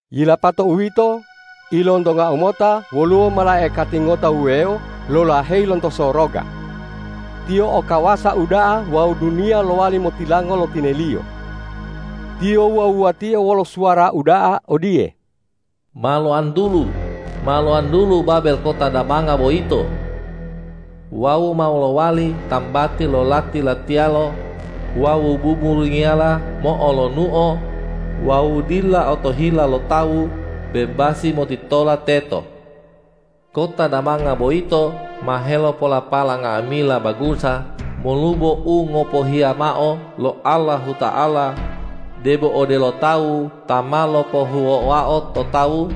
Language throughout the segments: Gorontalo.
Yilapato uwito, ilontongau mota woluwo malaikati ngota wuwewo lolaheyi lonto soroga. Tiyo o kawasa uda'a wawu duniya lowali motilango lo tineliyo. Tiyo wuwa-wuwatio wolo suwara uda'a odiye,”Ma loantulu, ma loantulu Babel kota damanga boyito! Wawu ma lowali tambati lo lati-latiyalo wawu buburungiyala mo'olonuo wawu dila otohila lo tawu bebasi motitola teto. Kota damanga boyito ma helopolapala nga'amila bangusa molubo u ngopohiya mao lo Allahuta'ala, debo odelo tawu ta ma lopohuwoao to tawu,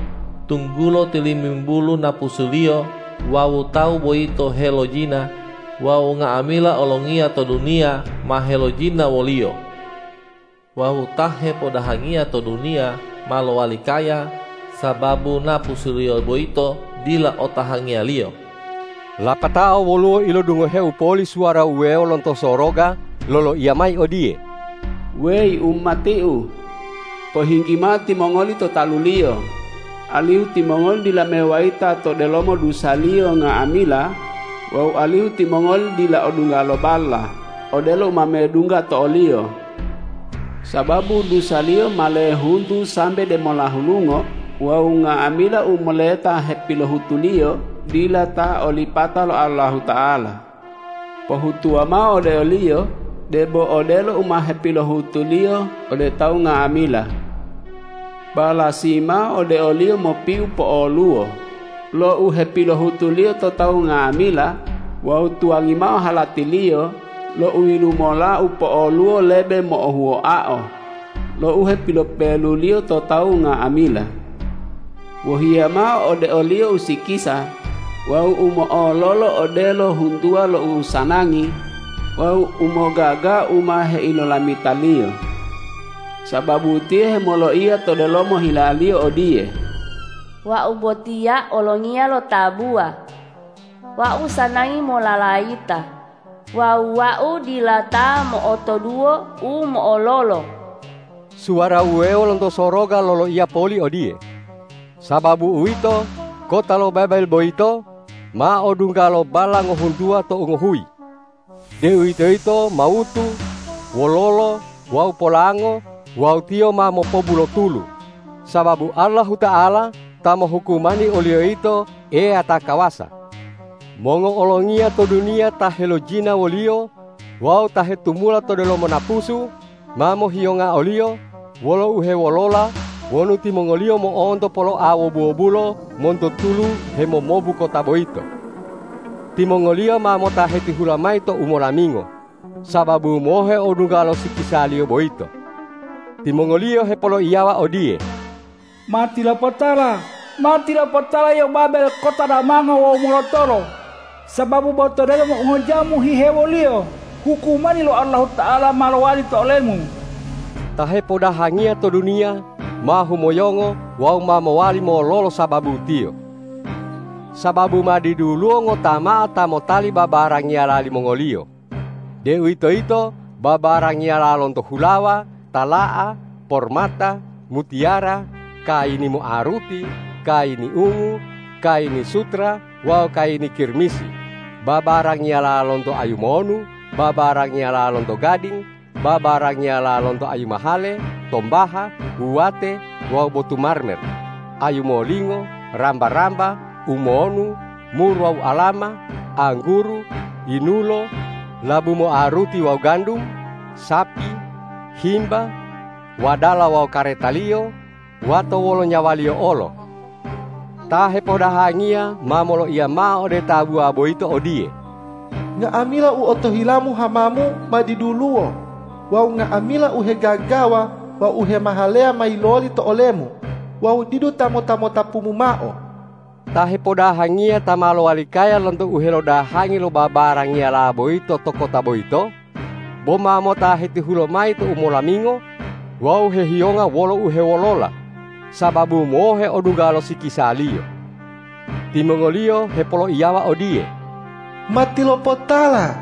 tunggulo tilimimbulu napusuliyo wawu tawu boyito helojina wawu nga'amila olongiya to duniya ma helojina woliyo. Wawu ta hepodahangiya to duniya ma lowali kaya, sababu napusuliyo boyito dila o tahangiyaliyo.” Lapatao woluwo ilodungoheu poli suwara wuwewo lonto soroga loloiya mayi odiye,”Weyi umati-U! Pohinggi mao timongoli to taluliyo, alihu timongoli dila mewayita to delomo dusaliyo nga'amila wawu alihu timongoli dila odungga lo balla odelo u ma medungga to oliyo. Sababu dusaliyo ma lehuntu sambe demola hulungo wawu nga'amila u moleta hepilohutuliyo dila ta olipata lo Allahuta'ala. Pohutuwa mao ode oliyo debo odelo u ma hepilohutuliyo ode tawu nga'amila. Balasi mao ode oliyo mopiu po'oluwo lo u hepilohutuliyo to tawu nga'amila wawu tuwangi mao halatiliyo lo uyilumola u po'oluwo lebe mo'ohuwoao lo u hepilopeluliyo to tawu nga'amila. Wohiya mao ode oliyo usikisa wawu u mo'ololo odelo huntuwa lo usanangi wawu umogaga u ma heilolamitaliyo. Sababu tiyo hemoloiya to delomo hilaliyo odiye, ’Wau botiya olongiya tabuwa. Wau sanangi mololayita wawu wau dila ta mo'otoduwo u mo'ololo.’” Suwara wuwewo lonto soroga loloiya poli odiye,”Sababu uwito, kota lo Babel boyito ma odungga lo balla ngohuntuwa tou ngohuyi, deuwitoyito mawutu, wololo wawu polango wawu tiyo ma mopobu lo tulu, sababu Allahuta'ala ta mohukumani oliyo yito Eya ta kawasa.” Mongo'olongiya to duniya ta helojina woliyo wawu ta hetumula to delomo napusu, ma mohiyonga oliyo wolo uhewolola wonu timongoliyo mo'onto poloa wobu-wobulo monto tulu hemomobu kota boyito. Timongoliyo ma mota hetihula mayi to umolamingo, sababu mohe odungga lo sikisaliyo boyito. Timongoliyo hepoloiyawa odiye,”Matilopotala, matilopotala yio Babel kota damango wawu molotolo, sababu bo to delomo ungojamu hihewoliyo hukumani lo Allahuta'ala ma lowali to olemu!” Ta hepodahangiya to duniya ma humoyongo wawu ma mowali mololo sababu tiyo. Sababu ma diduluwo ngota mao ta motali babarangiyala limongoliyo, deuwitoyito babarangiyala lonto hulawa, tala'a, pormata, mutiyara, kayini moaruti, kayini ungu, kayini sutera wawu kayini kirmizi, babarangiyala lonto ayu monu, babarangiyala lonto gading, babarangiyala lonto ayu mahale, tombaha, wuwate wawu botu marmer, ayu molingo, ramba-ramba, umonu, mur wawu alama, angguru, yinulo, labu moaruti wawu gandum, sapi, himba, wadala wawu karetaliyo, wato wolo nyawaliyo olo. Ta hepodahangiya ma moloiya mao ode tabuwa boyito odiye,”Nga'amila u otohilamu hamamu ma diduluwo wawu nga'amila u hegagawa wawu u hemahaleya ma yiloli to olemu wawu didu ta mota-motapumu mao.” Ta hepodahangiya ta ma lowali kaya lonto uhelodahangi lo babarangiyala boyito to kota boyito, bo ma mota hetihula mayi to umolamingo wawu hehiyonga wolo uhewolola, sababu mohe odungga lo sikisaliyo. Timongoliyo hepoloiyawa odiye,”Matilopotala,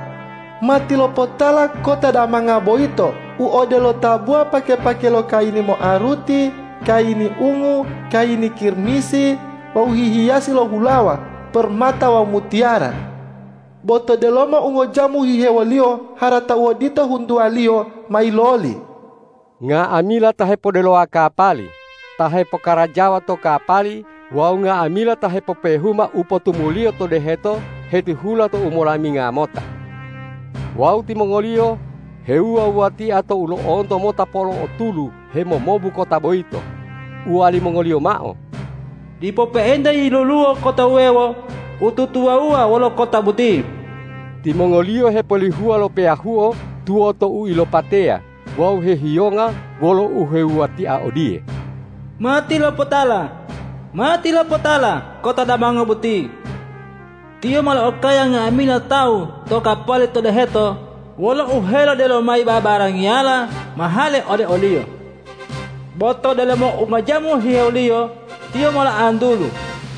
matilopotala kota damanga boyito u odelo tabuwa pake-pake lo kayini moaruti, kayini ungu, kayini kirmizi wawu hihiyasi lo hulawa, pormata wawu mutiyara. Bo to delomo ungojamu hihewoliyo harata odito huntuwaliyo ma yiloli!” Nga'amila ta hepoddelowa kapali, ta hepokarajawa to kapali wawu nga'amila ta hepopehuma u potumuliyo to deheto hetihula to umolaminga mota. Wawu timongoliyo hewuwa-wuwatia tou lo'onto mota polo'o tulu hemomobu kota boyito, uwalimongoliyo mao,”Dipo pe'enta yiloluwo kota wuwewo u tutuwawuwa wolo kota boti!” Timongoliyo hepolihuwa lo peyahuo tuwoto uilopateya wawu hehiyonga wolo uhewuwatia odiye,”Matilopotala, matilopotala kota damanga boti! Tiyo ma lo'okaya nga'amila tawu ta o kapali to deheto wolo uhelodelo mayi babarangiyala mahale ode oliyo. Bo to delomo ungojamu hihewoliyo tiyo ma loantulu.”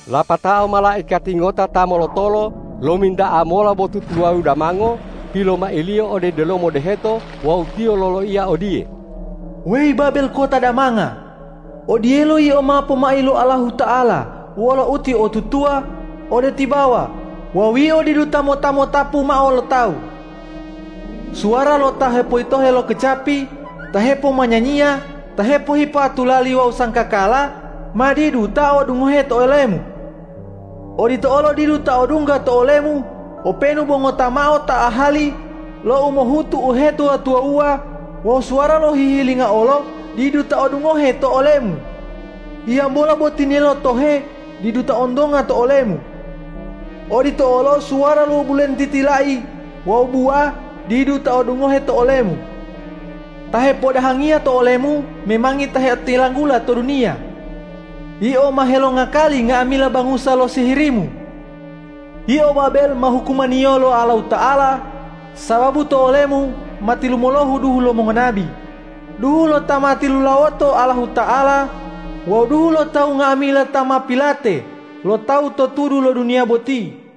Lapatao malaikati ngota ta molotolo lominta'a mola botu tuwawu damango pilomailiyo ode delomo deheto wawu tiyo loloiya odiye,”Weyi Babel kota damanga, odiyelo yio ma pomai lo Allahuta'ala wolo utiotutuwa ode tibawa wawu yio didu ta mota-motapu mao lo tawu! Suwara lo ta hepoyitohe lo kecapi, ta hepomanyanyiya, ta hepohipa tulali wawu sanggakala, ma didu ta odungohe to olemu. Odito olo didu ta odungga to olemu openu bo ngota mao ta ahali lo umohutu uhetuwa-tuwawuwa wawu suwara lo hihilinga olo didu ta odungohe to olemu. Hiyambola bo tinelo tohe didu ta ontonga to olemu. Odito olo suwara lo bulentiti lai wawu buwa didu ta odungohe to olemu. Ta hepodahangiya to olemu memangi ta heotilanggula to duniya. Yio ma helongakali nga'amila bangusa lo sihirimu. Yio Babel ma hukumaniyo lo Allahuta'ala, sababu to olemu ma tilumolohu duhu lo mongonabi, duhu lo ta ma tilulawoto Allahuta'ala wawu duhu lo tawu nga'amila ta ma pilate lo tawu totudu lo duniya boti.”